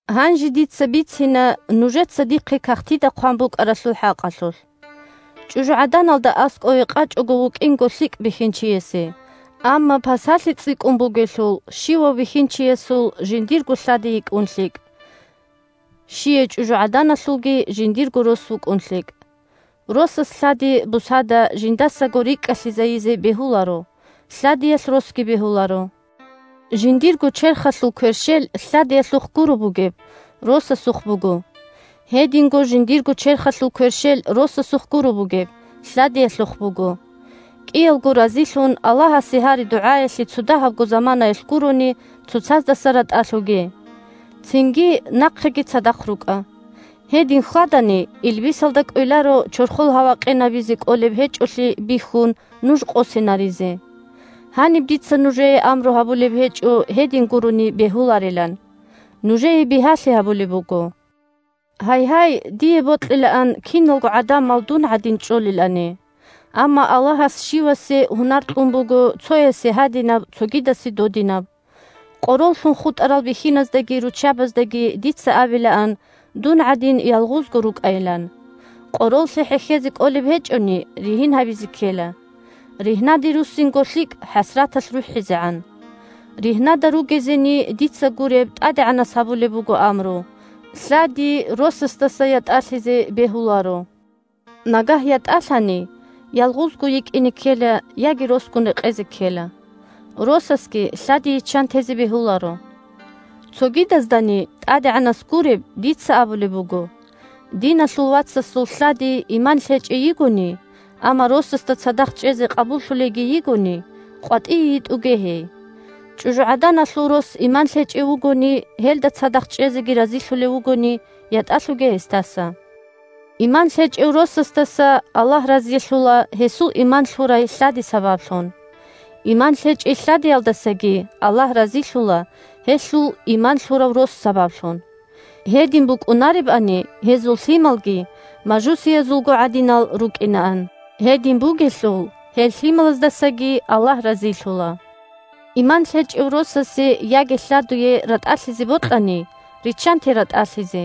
Гьанже дица бицина нужеца дихъе кагътида хъван букӀаралъул хӀакъалъулъ. ЧӀужугӀаданалда аскӀове къачӀого вукӀинго лъикӀ бихьинчиясе. Амма пасалъи цӀикӀкӀун бугелъул, щивав бихьинчиясул жиндирго лъади йикӀун лъикӀ, щияй чӀужугӀаданалъулги жиндирго рос вукӀун лъикӀ. Росас лъади бусада жиндасаго рикӀкӀалъизайизе бегьуларо, лъадиялъ росги бегьуларо. Жиндирго черхалъул кверщел лъадиялъухъ гуро бугеб, росасухъ буго. Гьединго жиндирго черхалъул кверщел росасухъ гуро бугеб, лъадиялъухъ буго. КӀиялго разилъун, Аллагьасе гьари-дугӀаялъе цодагьабго заманаялъ гурони, цоцаздаса ратӀалъуге. Цинги нахъеги цадахъ рукӀа. Гьедин хьвадани, илбисалда кӀвеларо, чорхол гьава къинабизе кӀолеб гьечӀолъи бихьун, нуж къосинаризе. Гьаниб дица нужее амру гьабулеб гьечӀо гьедин гурони бегьуларилан. Нужее бигьалъи гьабулеб буго. Гьайгьай, дие бокьилаан киналго гӀадамал дун гӀадин чӀолелани. Амма Аллагьас щивасе гьунар кьун буго: цоясе гьадинаб, цогидасе додинаб. Къороллъун хутӀарал бихьиназдаги руччабаздаги дица абилаан, дун гӀадин, ялгъузго рукӀайилан. Къороллъи хӀехьезе кӀолеб гьечӀони, ригьин гьабизе ккела. Ригьнаде руссинго лъикӀ, хӀасраталъ рухӀизегӀан. Ригьнада ругезени, дица гуреб, ТӀадегӀанас гьабулеб буго амру: лъади росасдаса ятӀалъизе бегьуларо. Нагагь ятӀалъани, ялгъузго йикӀине ккела яги росгун рекъезе ккела. Росасги лъади йиччан тезе бегьуларо. Цогидаздани, ТӀадегӀанас гуреб, дица абулеб буго: диналъул вацасул лъади иман лъечӀей йигони, амма росасда цадахъ чӀезе къабуллъулейги йигони, къватӀие йитӀуге гьей. ЧӀужугӀаданалъул рос иман лъечӀев вугони, гьелда цадахъ чӀезеги разилъулев вугони, ятӀалъуге гьесдаса. Иман лъечӀев росасдаса Аллагь разилъула гьесул иман лъурай лъади сабаблъун. Иман лъечӀей лъадиялдасаги Аллагь разилъула гьелъул иман лъурав рос сабаблъун. Гьедин букӀунаребани, гьезул лъималги мажусиязулго гӀадинал рукӀинаан. Гьедин бугелъул, гьел лъималаздасаги Аллагь разилъула. Иман лъечӀев росасе яги лъадуе ратӀалъизе бокьани, риччанте ратӀалъизе.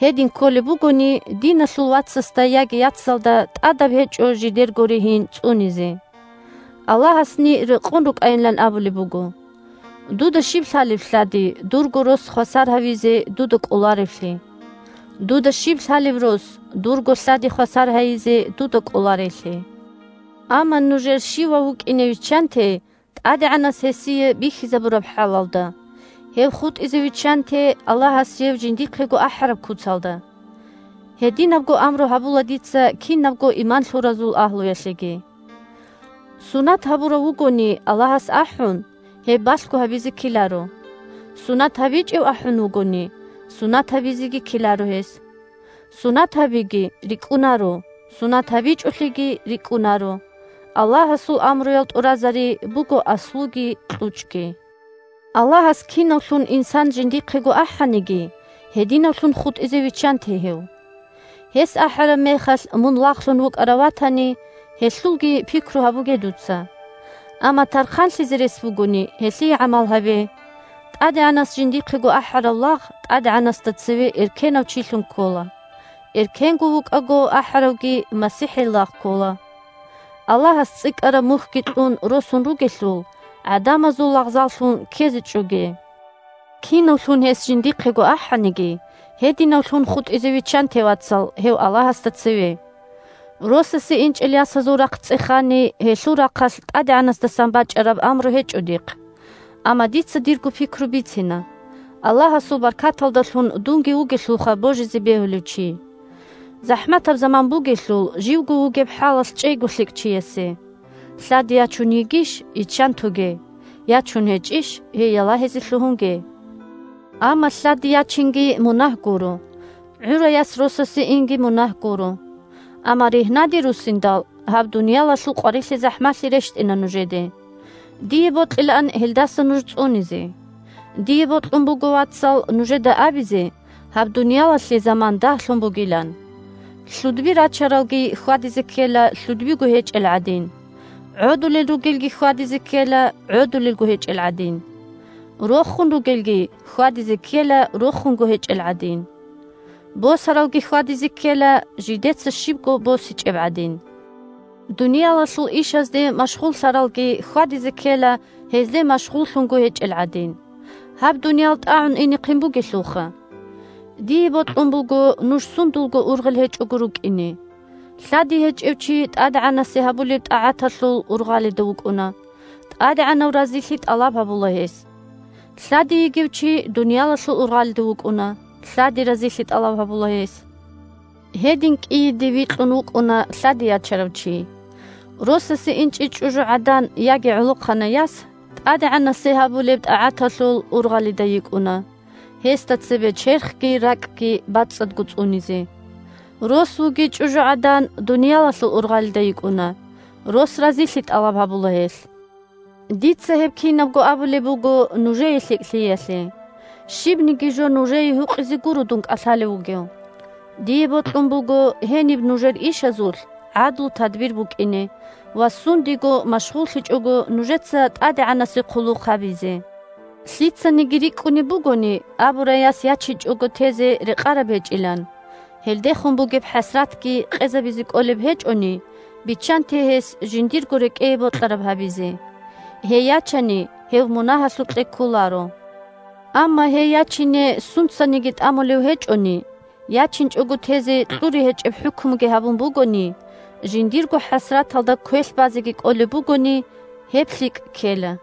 Гьедин кколеб бугони, диналъул вацасда яги яцалда тӀадаб гьечӀо жидерго ригьин цӀунизе. Аллагьасни рекъон рукӀайилан абулеб буго. Дуда щиб лъалеб, лъади, дурго рос хвасар гьавизе дуда кӀоларевлъи? Дуда щиб лъалеб, рос, дурго лъади хвасар гьайизе дуда кӀоларейлъи? Амма нужер щивав вукӀине виччанте ТӀадегӀанас гьесие бихьизабураб хӀалалда, гьев хутӀизе виччанте Аллагьас гьев жиндихъего ахӀараб куцалда. Гьединабго амру гьабула дица кинабго иман лъуразул агьлуялъеги. Сунат гьабурав вугони Аллагьас ахӀун, гьеб балъго гьабизе ккеларо. Сунат гьабичӀев ахӀун вугони, сунат гьабизеги ккеларо гьес. Сунат гьабиги – рикӀкӀунаро, сунат гьабичӀолъиги – рикӀкӀунаро, Аллагьасул амруял тӀуразари буго аслуги кьучӀги! Аллагьас кинавлъун инсан жиндихъего ахӀаниги, гьединавлъун хутӀизе виччанте гьев. Гьес ахӀараб мехалъ мун лагълъун вукӀарав ватани, гьелъулги пикру гьабуге дуца. Амма тархъанлъизе рес бугони, гьелъие гӀамал гьабе. ТӀадегӀанас жиндихъего ахӀарав лагъ ТӀадегӀанасда цеве эркенав чилъун ккола, эркенго вукӀаго ахӀаравги МасихӀил лагъ ккола. Аллагьас цӀикӀкӀараб мухьги кьун росун ругелъул, гӀадамазул лагъзаллъун ккезе чӀоге! Кинавлъун гьес жиндихъего ахӀаниги, гьединавлъун хутӀизе виччанте, вацал, гьев Аллагьасда цеве! Росасе инчӀел ясазул рахъ цӀехани, гьелъул рахъалъ ТӀадегӀанасдасан бачӀараб амру гьечӀо дихъ. Амма дица дирго пикру бицина, Аллагьасул баркаталдалъун дунги вугелъулха божизе бегьулев чи. ЗахӀматаб заман бугелъул, живго вугеб хӀалалъ чӀейго лъикӀ чиясе. Лъади ячун йигищ – йиччан тоге. Ячун гьечӀищ – гьей ялагьизе лъугьунге. Амма лъади ячинги мунагь гуро. ГӀурай яс росасе инги мунагь гуро. Амма ригьнаде руссиндал, гьаб дуниялалъул къварилъи-захӀмалъи рещтӀина нужеде. Дие бокьилаан гьелдаса нуж цӀунизе. Дие бокьун буго, вацал, нужеда абизе, гьаб дуниялалъе заман дагьлъун бугилан. Лъудби рачаралги хьвадизе ккела лъудбиго гьечӀел гӀадин. ГӀодулел ругелги хьвадизе ккела гӀодулелго гьечӀел гӀадин. Рохун ругелги хьвадизе ккела рохунго гьечӀел гӀадин. Босаралги хьвадизе ккела жидеца щибго босичӀеб гӀадин. Дуниялалъул ишазде машгъуллъаралги хьвадизе ккела гьезде машгъуллъунго гьечӀел гӀадин. Гьаб дуниял тӀагӀун инехъин бугелъулха! Дие бокьун буго нуж сундулго ургъел гьечӀого рукӀине. Лъади гьечӀев чи ТӀадегӀанасе гьабулеб тӀагӀаталъул ургъалида вукӀуна, ТӀадегӀанав разилъи тӀалаб гьабула гьес. Лъади йигев чи дуниялалъул ургъалида вукӀуна, лъади разилъи тӀалаб гьабула гьес. Гьедин кӀийиде викьун вукӀуна лъади ячарав чи. Росасе инчӀей чӀужугӀадан яги гӀолохъанай яс ТӀадегӀанасе гьабулеб тӀагӀаталъул ургъалида йикӀуна, гьесда цебе черхги ракӀги бацӀцӀадго цӀунизе. Рос вугей чӀужугӀадан дуниялалъул ургъалида йикӀуна, рос разилъи тӀалаб гьабула гьелъ. Дица гьеб кинабго абулеб буго нужее лъикӀлъиялъе. Щибниги жо нужее гьукъизе гуро дун кӀалъалев вугев. Дие бокьун буго гьениб нужер ишазулъ гӀадлу-тадбир букӀине ва сундего машгъуллъичӀого нужеца ТӀадегӀанасе хъулухъ гьабизе. Лъицаниги рикӀкӀунеб бугони абурай яс ячинчӀого тезе рекъараб гьечӀилан, гьелдехун бугеб хӀасратги къезабизе кӀолеб гьечӀони, биччанте гьес жиндирго рекӀее бокьараб гьабизе. Гьей ячани гьев мунагьалъукье кколаро. Амма гьей ячине сунцаниги тӀамулев гьечӀони, ячинчӀого тезе кьури гьечӀеб хӀукмуги гьабун бугони, жиндирго хӀасраталда квелъ базеги кӀолеб бугони, – гьеб лъикӀ ккела.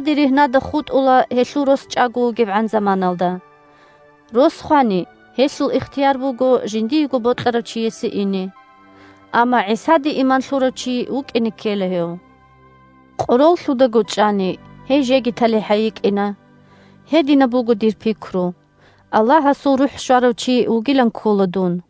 Лъади ригьнада хутӀула гьелъул рос чӀаго вугевгӀан заманалда. Рос хвани, гьелъул ихтияр буго жиндиего бокьарав чиясе ине. Амма ГӀисаде иман лъурав чи вукӀине ккела гьев. Къороллъудаго чӀани, гьей жеги талихӀай йикӀина. Гьединаб буго дир пикру, Аллагьасул РухӀ щварав чи вугилан ккола дун.